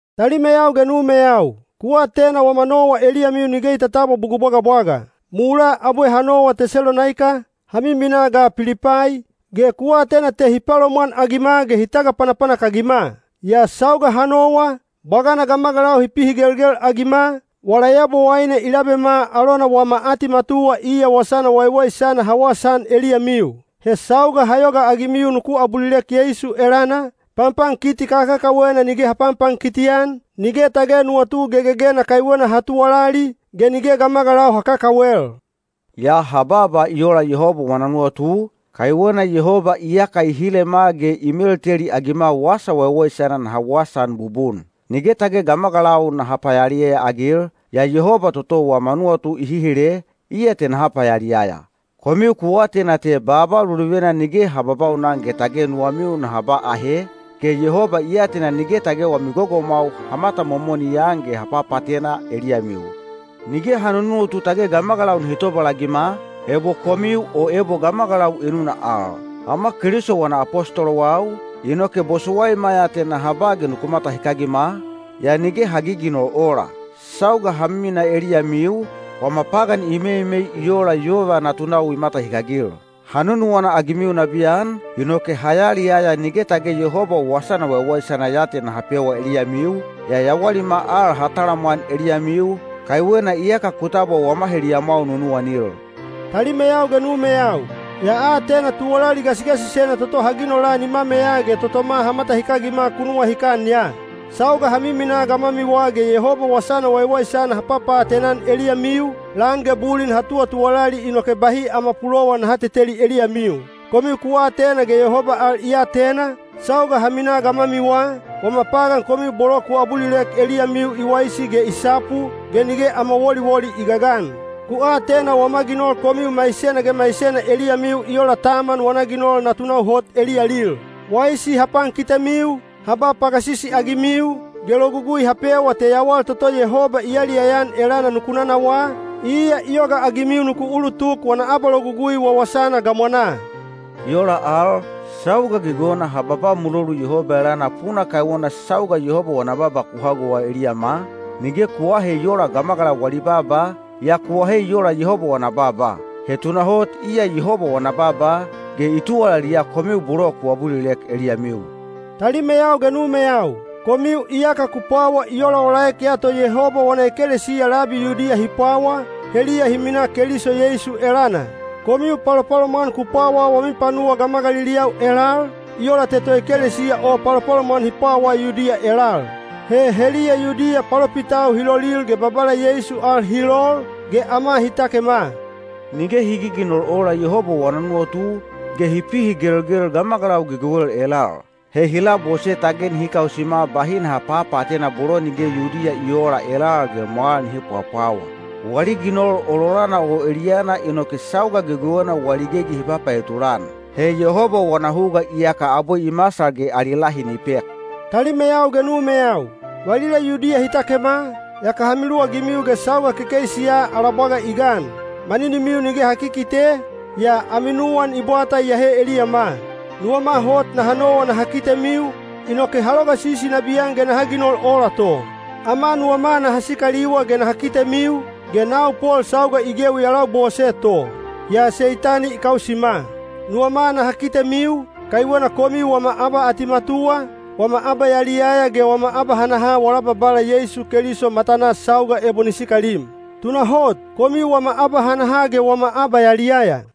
Talimeyau ge numeyau, ku atena wama nowa eliyamiu nige i tatabwa bugul bwagabwaga. Mulaa abwe ha nowa Tesalonaika, ha miminaa ga Pilipai, ge ku atena te hi palomwanagima ge hi tagapanapanak-agima. Yaa sauga ha nowa, bwagana gamagalau hi pihigelgel-agima, wala Yabowaine i labema alona wama atimatuwa iya wasana waiwaisana ha wasaan eliyamiu. He sauga ha yogaagimiu nuku abulilek Yeisu elana, panpankiti kakakawena nige ha panpankiti-an, nige tage nuwatu gegegena kaiwena ha tuwalali, ge nige gamagalau ha kakawel. Yaa ha baaba i ola Yehoba wana nuwatu, kaiwena Yehoba iyaka i hilema ge i melteliagima Wasa Waiwaisana naha wasaan bubun. Nige tage gamagalau naha payaliyaya-agil, yaa Yehoba toto wama nuwatu i hihile, iya te naha payaliyaya. Komiu ku atena te baaba luluvena nige ha babaunan ge tage nuwamiu naha ba ahe, ge Yehoba i atena nige tage wami gogomwau ha matamomoni-an ge ha papaatena eliyamiu. Nige ha nunuwatu tage gamagalau nihi tobalagima, ebo komiu o ebo gamagalau enuna al. Ama Keliso wana apostolowau, inoke bosowaima ya te naha ba ge nuku matahikagima, yaa nige ha giginol ola. Sauga ha miminaa eliyamiu, wama pagan i meimei i ola yova natunau i matahikagil. Ha nunuwana-agimiu nabiyan, inoke ha yaliyaya nige tage Yehoba Wasana Waiwaisana ya te ha pewa eliyamiu, yaa yawalima al ha talamwan eliyamiu, kaiwena iyaka ku tabwa wama heliyamwau nunuwanil. Talimeyau ge numeyau, ya atena tuwalali gasigasisena toto ha ginola nimameya ge totoma ha matahikagima ku nuwahikan ya. Sauga ha miminaa gamwamiwa ge Yehoba Wasana Waiwaisana ha papaatena-an eliyamiu, lan ge bulin ha tuwatuwalali inoke bahi ama pulowan naha teteli eliyamiu. Komiu ku atena ge Yehoba al i atena, sauga ha minaa gamwamiwa, wama pagan komiu bolo ku abulilek eliyamiu i waisi ge i sapu, ge nige ama woliwoli i gagan. Ku atena wama ginol komiu maisena ge maisena eliyamiu i ola taman wana ginol natunau hot eliyalil. Waisi ha pankitemiu, ha ba pagasisi-agimiu, ge logugui ha pewa te yawal toto Yehoba i yaliyaya-an elana nuku nanawaa, iya i yogaagimiu nuku ulutuk wana abalogugui wawasana gamwanaa. I ola al, sauga gegewena ha babaa mulolu Yehoba elana puna kaiwena sauga Yehoba wana baaba ku hagowa eliyama, nige ku aahe i oola gamagalau wali baaba, yaa ku ahe i ola Yehoba wana baaba. He tunahot iya Yehoba wana baaba, ge i tuwalaliya komiu bolo ku abulilek eliyamiu. Talimeyau ge numeyau, komiu iyaka ku pwawa i olaolaek ya to Yehoba wana ekelesiya labi Yudiya hi pwawa, heliya hi minaa Keliso Yeisu elana. Komiu palopalomwan ku pwawa wami panuwa gamagaliliyau elal, i ola te toekelesiya o palopalomwan hi pwawa Yudiya elal. He heliya Yudiya palopitau hi lolil ge Babala Yeisu al hi lol, ge ama hi takema. Nige hi giginol ola Yehoba wana nuwatu, ge hi pihigelgel gamagalau gegewel elal. He hi labose tage nihi kausima bahi naha papaatena bolo nige Yudiya i oola elal ge mwal nihi pwapwawa. Wali ginol ololana o eliyana inoke sauga gegewena wali gegi hi papaetulan. He Yehoba wana huga iyaka abwe i masal ge ali lahi ni pek. Talimeyau ge numeyau, valila Yudiya hi takema, yaka ha miluwagimiu ge sauga kekeisi ya ala bwaga i gan. Maninimiu nige ha kikite, yaa ami nuwan i bwata iyahe eliyama. Nuwama hot naha nowa naha kitemiu, inoke ha logasisi nabiyan ge naha ginol ola to. Ama nuwama naha sikaliwa ge naha kitemiu, ge nau Pol sauga i gewi ya labose to. Yaa Seitani i kausima. Nuwama naha kitemiu, kaiwena komiu wama abaatimatuwa, wama abayaliyaya ge wama abahanaha wala Babala Yeisu Keliso matanaa sauga ebo ni sikalim. Tunahot, komiu wama abahanaha ge wama abayaliyaya.